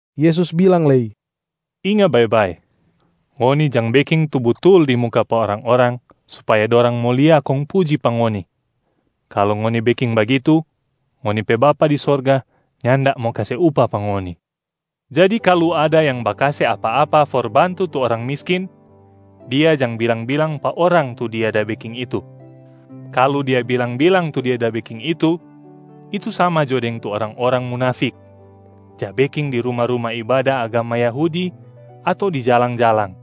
Yesus bilang lei, “Inga bae-bae, ngoni jang beking tu butul di muka pa orang-orang supaya dorang mo lia kong puji pa ngoni. Kalu ngoni beking bagitu, ngoni pe Bapa di sorga nyanda mo kase upah pa ngoni. Jadi kalu ada yang bakase apa-apa for bantu tu orang miskin, dia jang bilang-bilang pa orang tu dia da beking itu. Kalu dia bilang-bilang tu dia da beking itu, itu sama jo deng tu orang-orang munafik ja beking di ruma-ruma ibada agama Yahudi ato di jalang-jalang.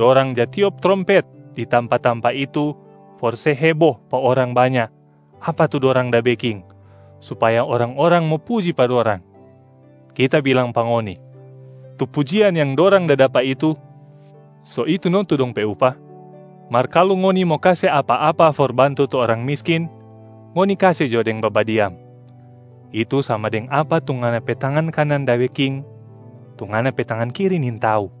Dorang ja tiop trompet di tampa-tampa itu for se hebo pa orang banya apa tu dorang da beking supaya orang-orang mo puji pa dorang. Kita bilang pa ngoni, tu pujian yang dorang da dapa itu, so itu no tu dong pe upah. Mar kalu ngoni mo kase apa-apa for bantu tu orang miskin, ngoni kase jo deng babadiam, itu sama deng apa tu ngana pe tangan kanan da beking, tu ngana pe tangan kiri nintau.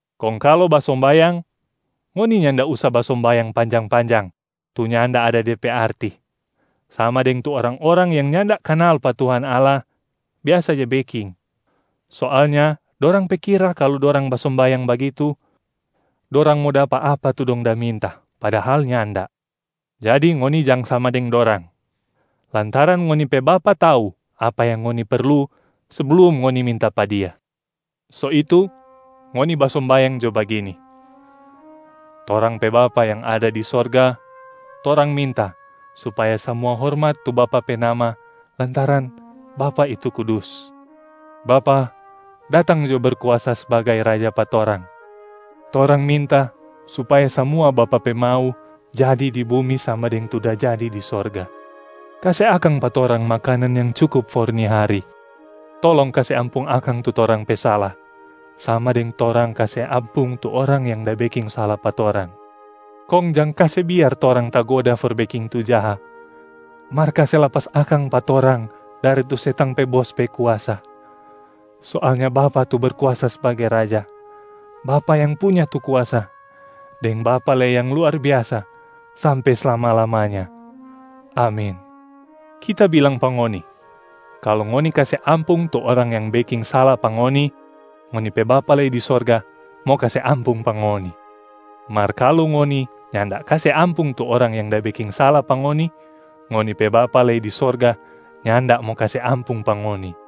Kong kalu basombayang, ngoni nyanda usa basombayang panjang-panjang tu nyanda ada de pe arti, sama deng tu orang-orang yang nyanda kanal pa Tuhan Allah biasa ja beking. Soalnya dorang pe kira kalu dorang basombayang bagitu, dorang mo dapa apa tu dong da minta, padahal nyanda. Jadi ngoni jang sama deng dorang, lantaran ngoni pe Bapa tau apa yang ngoni perlu seblum ngoni minta pa Dia. So itu, ngoni basombayang jo bagini, ‘Torang pe Bapa yang ada di sorga, torang minta supaya samua hormat tu Bapa pe nama lantaran Bapa itu kudus. Bapa, datang jo Berkuasa sbagai Raja pa torang. Torang minta supaya samua Bapa pe mau jadi di bumi sama deng tu da jadi di sorga. Kase akang pa torang makanan yang cukup for ni hari. Tolong kase ampung akang tu torang pe sala, sama deng torang kase ampung tu orang yang da beking sala pa torang. Kong jang kase biar torang tagoda for beking tu jaha, mar kase lapas akang pa torang dari tu setang pe bos pe kuasa. [Soalnya Bapa tu Berkuasa sbagai Raja, Bapa yang punya tu kuasa, deng Bapa lei yang luar biasa sampe slama-lamanya. Amin.’] Kita bilang pa ngoni, kalu ngoni kase ampung tu orang yang beking sala pa ngoni, ngoni pe Bapa lei di sorga mo kase ampung pa ngoni. Mar kalu ngoni nyanda kase ampung tu orang yang da beking sala pa ngoni, ngoni pe Bapa lei di sorga nyanda mo kase ampung pa ngoni.”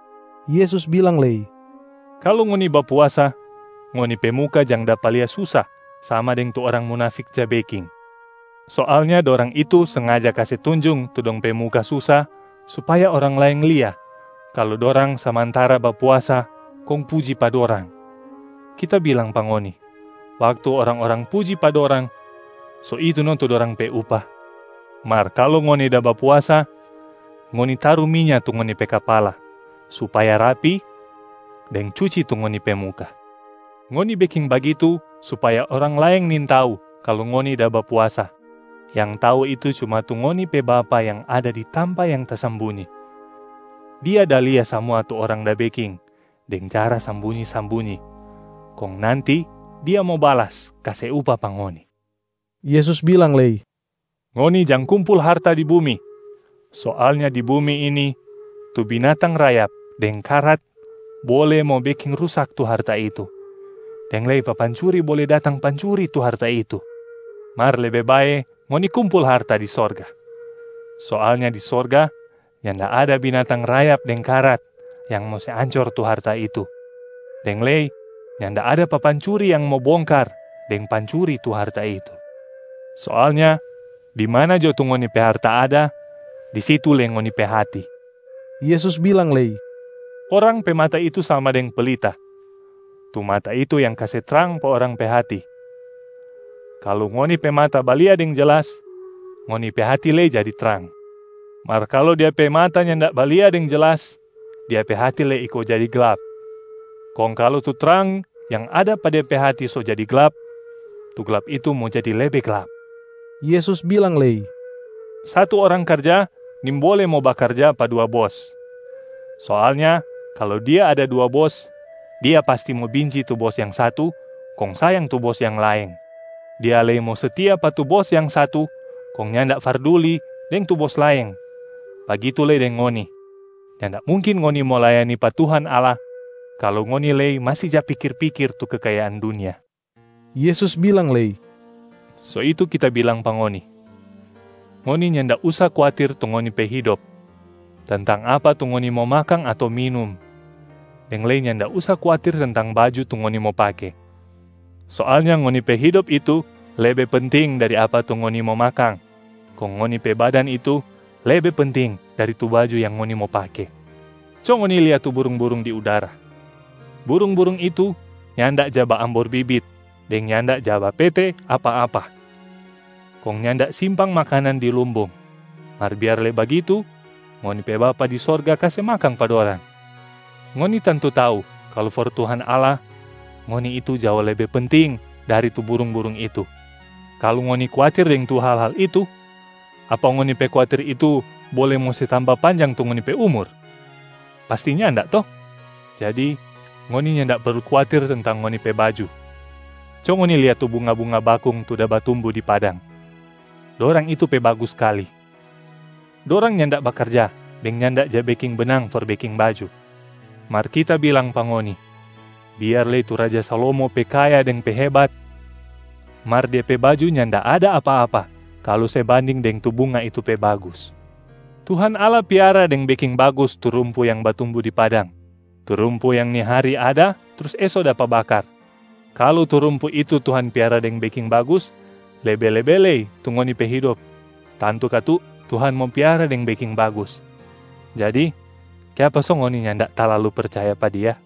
Yesus bilang lei, “Kalu ngoni bapuasa, ngoni pe muka jang dapa lia susa sama deng tu orang munafik ja beking. Soalnya dorang itu sengaja kase tunjung tu dong pe muka susa supaya orang laeng lia kalu dorang samantara bapuasa kong puji pa dorang. Kita bilang pa ngoni, waktu orang-orang puji pa dorang, so itu no tu dorang pe upah. Mar kalu ngoni da bapuasa, ngoni taru minya tu ngoni pe kapala supaya rapi deng cuci tu ngoni pe muka. Ngoni beking bagitu supaya orang laeng nintau kalu ngoni da bapuasa, yang tau itu cuma tu ngoni pe Bapa yang ada di tampa yang tasambunyi. Dia da lia samua tu orang da beking deng cara sambunyi-sambunyi, kong nanti Dia mo balas kase upah pa ngoni.” Yesus bilang lei, “Ngoni jang kumpul harta di bumi. Soalnya di bumi ini, tu binatang rayap deng karat bole mo beking rusak tu harta itu, deng lei papancuri bole datang pancuri tu harta itu. Mar lebe bae ngoni kumpul harta di sorga. Soalnya di sorga, nyanda ada binatang rayap deng karat yang mo se ancor tu harta itu, deng lei nyanda ada papancuri yang mo bongkar deng pancuri tu harta itu. Soalnya di mana jo tu ngoni pe harta ada, di situ lei ngoni pe hati.” Yesus bilang lei, “Orang pe mata itu sama deng pelita. Tu mata itu yang kase trang pa orang pe hati. Kalu ngoni pe mata balia deng jelas, ngoni pe hati lei jadi trang.a Mar kalu dia pe mata nyanda balia deng jelas, dia pe hati lei iko jadi glap. Kong kalu tu trang yang ada pa dia pe hati so jadi glap, tu glap itu mo jadi lebe glap.” Yesus bilang lei, “Satu orang karja nimbole mo bakarja pa dua bos. Soalnya kalu dia ada dua bos, dia pasti mo binci tu bos yang satu kong sayang tu bos yang laeng, dia lei mo setia pa tu bos yang satu kong nyanda farduli deng tu bos laeng. Bagitu lei deng ngoni, nyanda mungkin ngoni mo layani pa Tuhan Allah kalu ngoni lei masi ja pikir-pikir tu kekayaan dunia.” Yesus bilang lei, “So itu kita bilang pa ngoni, ngoni nyanda usa kuatir tu ngoni pe hidop, tentang apa tu ngoni mo makang ato minum, deng lei nyanda usa kuatir tentang baju tu ngoni mo pake. Soalnya ngoni pe hidop itu lebe penting dari apa tu ngoni mo makang, kong ngoni pe badan itu lebe penting dari tu baju yang ngoni mo pake. Co ngoni lia tu burung-burung di udara! Burung-burung itu nyanda ja baambor bibit deng nyanda ja bapete apa-apa kong nyanda simpang makanan di lumbung, mar biar lei bagitu ngoni pe Bapa di sorga kase makang pa dorang. Ngoni tantu tau kalu for Tuhan Allah, ngoni itu jao lebe penting dari tu burung-burung itu. Kalu ngoni kuatir deng tu hal-hal itu, apa ngoni pe kuatir itu bole mo se tamba panjang tu ngoni pe umur? Pasti nyanda to? Jadi ngoni nyanda perlu kuatir tentang ngoni pe baju. Co ngoni lia tu bunga-bunga bakung tu da batumbu di padang, dorang itu pe bagus skali. Dorang nyanda bakarja deng nyanda ja beking benang for beking baju. Mar Kita bilang pa ngoni, biar lei tu raja Salomo pe kaya deng pe hebat, mar dia pe baju nyanda ada apa-apa kalu se banding deng tu bunga itu pe bagus. Tuhan Allah piara deng beking bagus tu rumpu yang batumbu di padang, tu rumpu yang ni hari ada trus eso dapa bakar. Kalu tu rumpu itu Tuhan piara deng beking bagus, lebe-lebe lei tu ngoni pe hidop tantu katu Tuhan mo piara deng beking bagus. Jadi kiapa so ngoni nyanda talalu percaya pa Dia?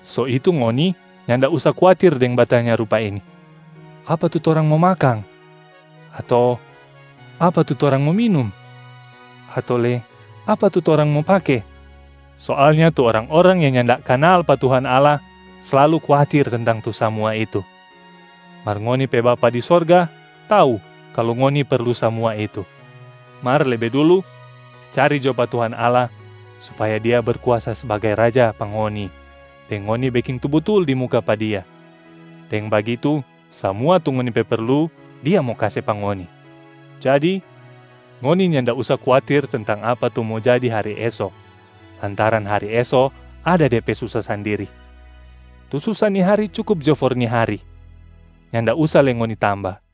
So itu ngoni nyanda usa kuatir deng batanya rupa ini, ‘Apa tu torang mo makang?’ ato ‘Apa tu torang mo minum?’ ato lei ‘Apa tu torang mo pake?’ Soalnya tu orang-orang yang nyanda kanal pa Tuhan Allah slalu kuatir tentang tu samua itu, mar ngoni pe Bapa di sorga tau kalu ngoni perlu samua itu. Mar lebe dulu, cari jo pa Tuhan Allah supaya Dia Berkuasa sbagai Raja pa ngoni deng ngoni beking tu butul di muka pa Dia. Deng bagitu, samua tu ngoni pe perlu Dia mo kase pa ngoni. Jadi, ngoni nyanda usa kuatir tentang apa tu mo jadi hari eso lantaran hari eso ada de pe susa sandiri. Tu susa ni hari cukup jo for ni hari, nyanda usa lei ngoni tamba.”